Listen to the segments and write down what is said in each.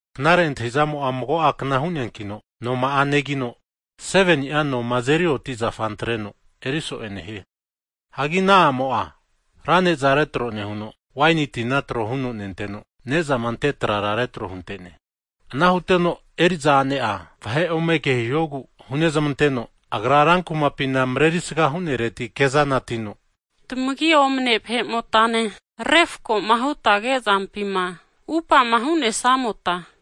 Knare antahizamo'a mago a'kna hu'neankino noma'a negino, 7ni'a noma azeri oti zafa antreno erisoe nehie. Hagi ana a'mo'a ra neza retro nehuno, waini tina tro huno nenteno, nezama ante trara retro huntene. Ana huteno eriza a'ne'a, vahe ome kehihogu hunezamanteno, agra rankumapina marerisga hunereti kezana atino, tamagi omane vahe'motane refakoma hutama kezampima atupama hu'nesamota,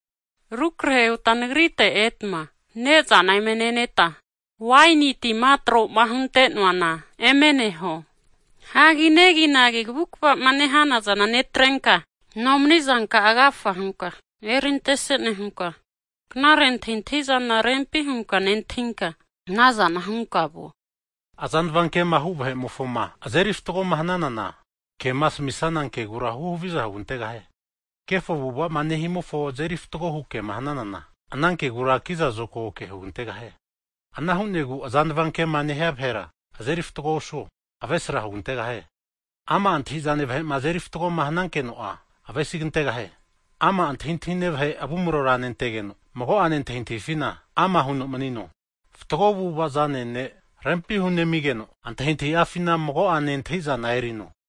rukrehe huta nagrite etma ne'zana eme neneta, waini tima tro'ma huntenoana eme neho. Hagi neginagi kavukavama nehanazana netrenka nomanizanka'a agafa hunka erintese nehunka knare antahintahizana rempi hunka nentahinka anazana hunka vuo. Azanava kema hu vahe'mofoma azeri fatgoma hananana, kema asamisana kegura huhaviza hugantegahie. Kefo avu'avama nehanimofo azeri fatgo hu kema hananana, ana kegura kiza zokago ke hugantegahie. Ana hu'negu azanava ke'ma nehia vahera azeri fatgo osuo, avesra hugantegahie. Ama' antahizane vahe'ma azeri fatgoma hanankeno'a, avesigantegahie. Ama' antahintahine vahe avumrora nentegeno mago'ane antahintahifina, ama huno manino. Fatgo avu'ava zane ne' rempi hunemigeno antahintahi'afina mago'ane antahizana erino.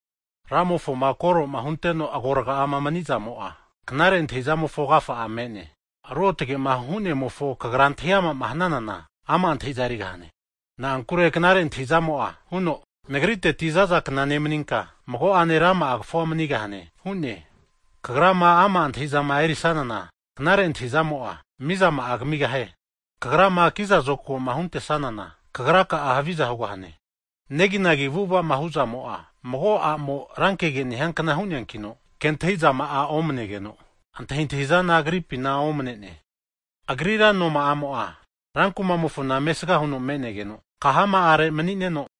Ramofoma koroma hunteno agorga'ama manizamo'a, knare antahizamofo agafa me'ne. Ruotage'ma Hu'nemofo kagra antahi ama'ma hananana, ama' antahiza erigahane. Na'ankure knare antahizamo'a huno, nagriteti zazakna nemaninka mago'ane rama'a kafu manigahane hune. Kagrama ama' antahizama erisanana, knare antahizamo'a, mizama'a kamigahie. Kagrama kiza zokagoma huntesanana kagra'a haviza hugahane. Neginagi avu'avama hu'zamo'a mago a'mo rankege nehiankna hu'neankino, ke antahizama'a omanegeno, antahintahizana agripina omanene. Agrira noma'amo'a rankumamofona mesga huno me'negeno kahama'are manineno,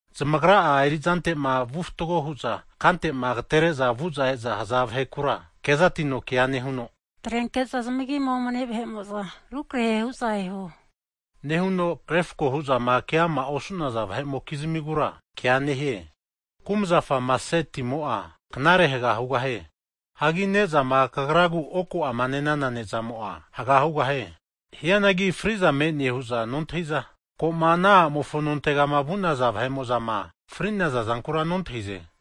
zamagra'a erizante'ma vu fatgo huza kantema agatere'za vu'za e'zama haza vahekura, kezatino kea huno, atrenke'za zamagi omne vahe'mo'za rukrahe hu'za eho, nehuno refko hu'zama ke ama' osu'naza vahe'mokizmigura kea nehie. Kumzafama asenana timo'a knare haga hugahie. Hagi ne'zama kagragu oku'ama ne'nana ne'zamo'a haga hugahie. Hianagi fri'za me'ne hu'za nontahiza, ko'ma ana a'mofo nontegama vu'naza vahe'mo'zama fri'naza zankura nontahize.